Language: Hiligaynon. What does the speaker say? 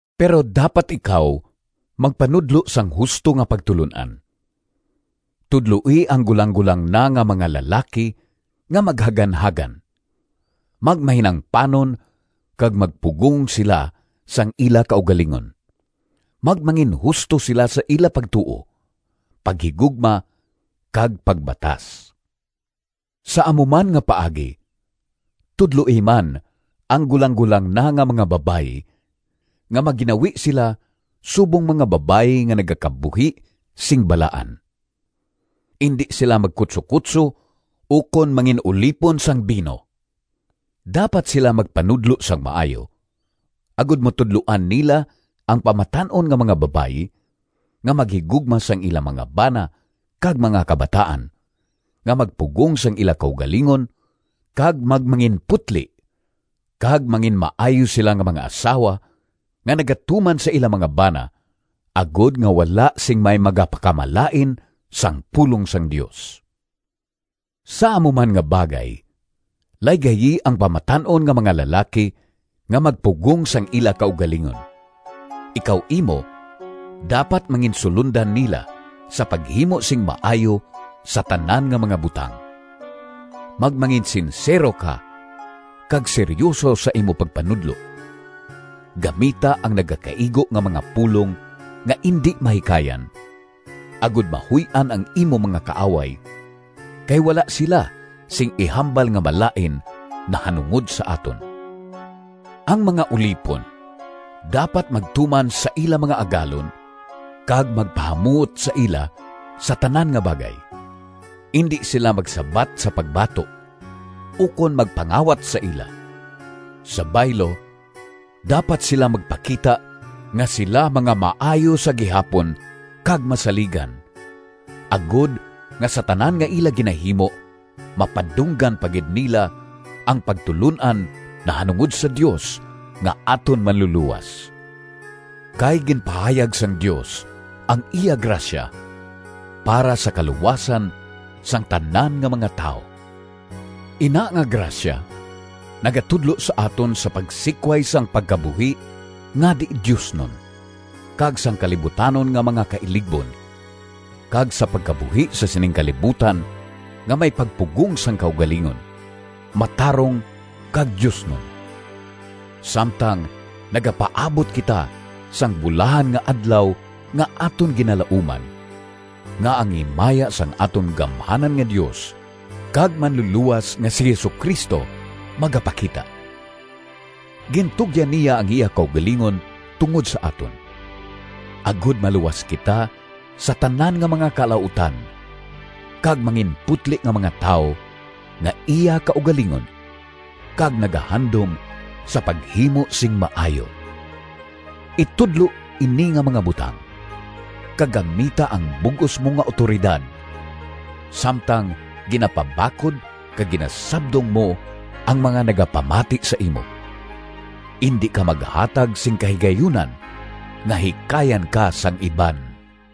Pero dapat ikaw magpanudlo sang husto nga pagtulon-an. Tudloi ang gulanggolang na nga mga lalaki nga maghaganhagan, magmahinangpanon kag magpugong sila sang ila kaugalingon; magmanginhusto sila sa ila pagtuo, paghigugma, kag pagbatas. Sa amo man nga paagi tudloi man ang gulanggolang na nga mga babayi nga magginawi sila subong mga babayi nga nagakabuhi sing balaan. Indi sila magkutsokutso ukon mangin-ulipon sang bino. Dapat sila magpanudlo sang maayo, agod matudloan nila ang pamatan-on nga mga babayi nga maghigugma sang ila mga bana kag mga kabataan, nga magpugong sang ila kaugalingon kag magmanginputli, kag manginmaayo sila nga mga asawa, nga nagatuman sa ila mga bana, agod nga wala sing may magapakamalain sang pulong sang Dios. Sa amo man nga bagay laygayi ang pamatan-on nga mga lalaki nga magpugong sang ila kaugalingon. Ikaw imo dapat manginsulondan nila sa paghimo sing maayo sa tanan nga mga butang. Magmanginsinsero ka kag seryuso sa imo pagpanudlo. Gamita ang nagakaigo nga mga pulong nga indi mahikayan, agod mahuy-an ang imo mga kaaway, kay wala sila sing ihambal nga malain nahanungod sa aton. Ang mga ulipon dapat magtuman sa ila mga agalon kag magpahamuot sa ila sa tanan nga bagay. Indi sila magsabat sa pagbato, ukon magpangawat sa ila. Sa baylo, dapat sila magpakita nga sila mga maayo sa gihapon kag masaligan, agod nga sa tanan nga ila ginahimo mapadunggan pa gid nila ang pagtulon-an nahanungod sa Dios nga aton Manlulowas. Kay ginpahayag sang Dios ang iya grasya para sa kaluwasan sang tanan nga mga tawo. Ina nga grasya nagatudlo sa aton sa pagsikway sang pagkabuhi nga di-diosnon kag sang kalibutanon nga mga kailigbon, kag sa pagkabuhi sa sining kalibutan nga may pagpugong sang kaugalingon, matarong kag diosnon, samtang nagapaabot kita sang bulahan nga Adlaw nga aton ginalauman, nga ang himaya sang aton gamhanan nga Dios kag Manlulowas nga si Jesu-Cristo magapakita. Gintugyan niya ang iya kaugalingon tungod sa aton, agod maluwas kita sa tanan nga mga kalautan kag manginputli nga mga tawo nga iya kaugalingon kag nagahandom sa paghimo sing maayo. Itudlo ini nga mga butang, kag gamita ang bug-os mo nga awtoridad, samtang ginapabakod kag ginasabdong mo ang mga nagapamati sa imo. Indi ka maghatag sing kahigayunan nga hikayan ka sang iban.